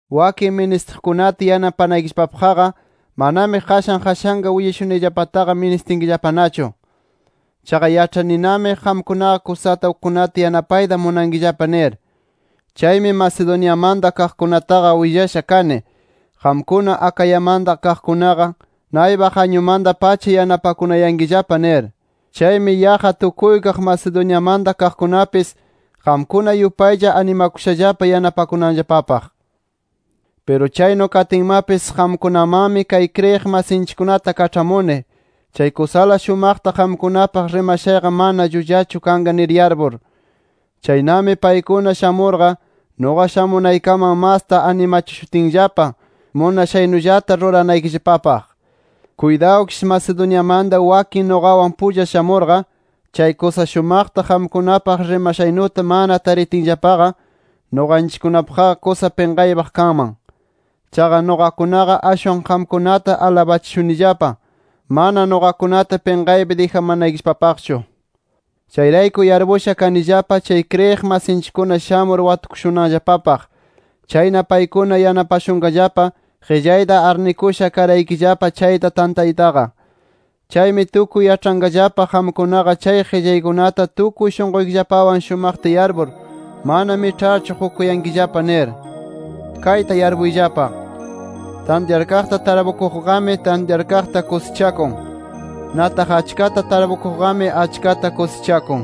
Wakin ministiqkunata yanapanaykillapapaqqa, manami qashan qashanqa willashunayllapataqa ministinkillapanachu. Chaqa yaĉhaninami, qamkunaqa kusata ukkunata yanapayta munankillapa nir. Chaymi Macedoniamanta kaqkunataqa willasha kani, qamkuna Acayamanta kaqkunaqa naypaq añumanta-pacha yanapakunayankillapa nir. Chaymi yaqqa tukuykaq Macedoniamanta kaqkunapis, qamkuna yupaylla animakushallapa yanapakunanllapapaq. Piru chaynu katinmapis, qamkunamanmi kay kriyiq masinchikkunata kaĉhamuni, chay kusala shumaqta qamkunapaq rimashayqa ama llullachu kanqa nir yarpur. Chaynami paykuna shamurqa, nuqa shamunaykaman masta animachishutinllapa, munashaynullata ruranaykillapapaq. Kuytawkish Macedoniamanta wakin nuqawan pulla shamurqa, chay kusa shumaqta qamkunapaq rimashaynuta, mana taritinllapaqa, nuqanchikkunapaqqa kusa pinqaypaq kanman. Chaqa nuqakunaqa ashwan qamkunata alabachishunillapa, mana nuqakunata pinqaypi dijamanaykillapapaqchu. Chayrayku yarpusha kanillapa chay kriyiq masinchikkuna shamur watukushunanllapapaq. Chayna paykuna yanapashunqallapa, qillayta arnikusha karaykillapa chayta tantaytaqa. Chaymi tukuy yaĉhanqallapa qamkunaqa chay qillaykunata tukuy shunquykillapawan shumaqta yarpur, mana miĉharchu qukuyankillapa nir. Kayta yarpuyllapa: Tantyarkaqta tarpukuqqami, tantyarkaqta kusichakun. Nataq achkata tarpukuqqami, achkata kusichakun.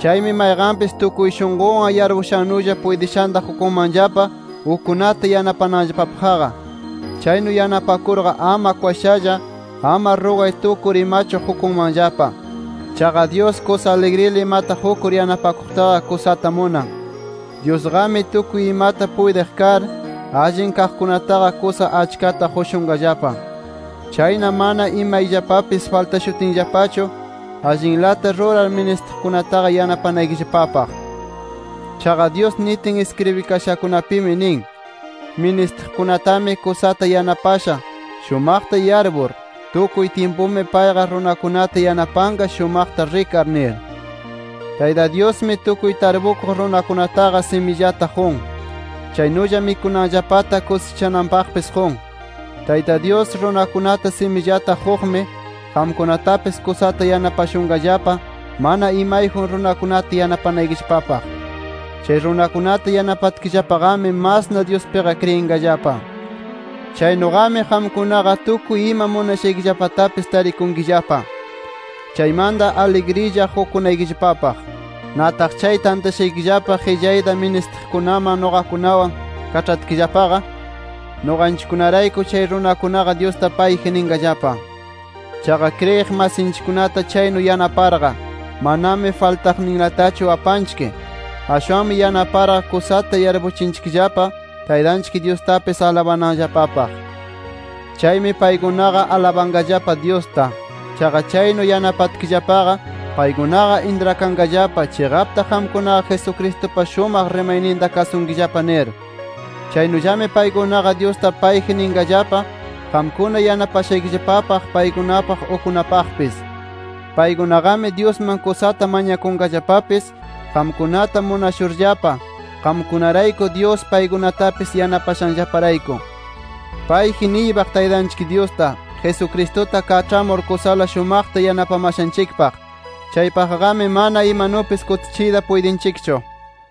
Chaymi mayqanpis tukuy shunqunwan yarpushannulla puytishanta qukunmanllapa ukkunata yanapananllapapaqqa. Chaynu yanapakurqa, ama kwashalla, ama rugay tukur imachu qukunmanllapa. Chaqa Dyus kusa aligrila imata qukur yanapakuqtaqa, kusata munan. Dyusqami tukuy imata puytiq kar, allin kaqkunataqa kusa achkata qushunqallapa. Chayna mana imayllapapis faltashutinllapachu, allinlata rurar ministiqkunataqa yanapanaykillapapaq. Chaqa, Dyus nitin iskribikashakunapimi nin: “Ministiqkunatami kusata yanapasha, shumaqta yarpur. Tukuy tyimpumi payqa runakunata yanapanqa shumaqta rikar” nir. Tayta Dyusmi, tukuy tarpukuq runakunataqa simillata qun. Chaynulla mikunanllapata kusichananpaqpis qun. Tayta Dyus runakunata simillata quqmi, qamkunatapis kusata yanapashunqallapa mana imayjun runakunata yanapanaykillapapaq. Chay runakunata yanapatkillapaqami, masna Dyuspiqa kriyinqallapa. Chaynuqami, qamkunaqa tukuy ima munashaykillapatapis tarikunkillapa. Chaymanta aligrilla qukunaykillapapaq. Nataq chay tantashaykillapa qillayta ministiqkunaman nuqakunawan kaĉhatkillapaqa, nuqanchikkunarayku chay runakunaqa, Dyusta payji ninqallapa. Chaqa kriyiq masinchikkunata chaynu yanaparqa, manami faltaqninlatachu apanchik. Ashwanmi yanaparqa, kusata yarpuchinchikllapa Taytanchik Dyustapis alabananllapapaq. Chaymi paykunaqa alabanqallapa Dyusta. Chaqa chaynu yanapatkillapaqa paykunaqa intrakanqallapa, chiqapta qamkunaqa Jesucristupa shumaq rimayninta kasunkillapa nir. Chaynullami paykunaqa Dyusta payji ninqallapa qamkuna yanapashaykillapapaq, paykunapaq, ukkunapaqpis. Paykunaqami, Dyusman kusata mañakunqallapapis qamkunata munashurllapa, qamkunarayku Dyus paykunatapis yanapashanllaparayku. ¡Payji niypaq Taytanchik Dyusta, Jesucristuta kaĉhamur kusala shumaqta yanapamashanchikpaq! ¡Chaypaqqami mana imanupis kutichiyta puytinchikchu!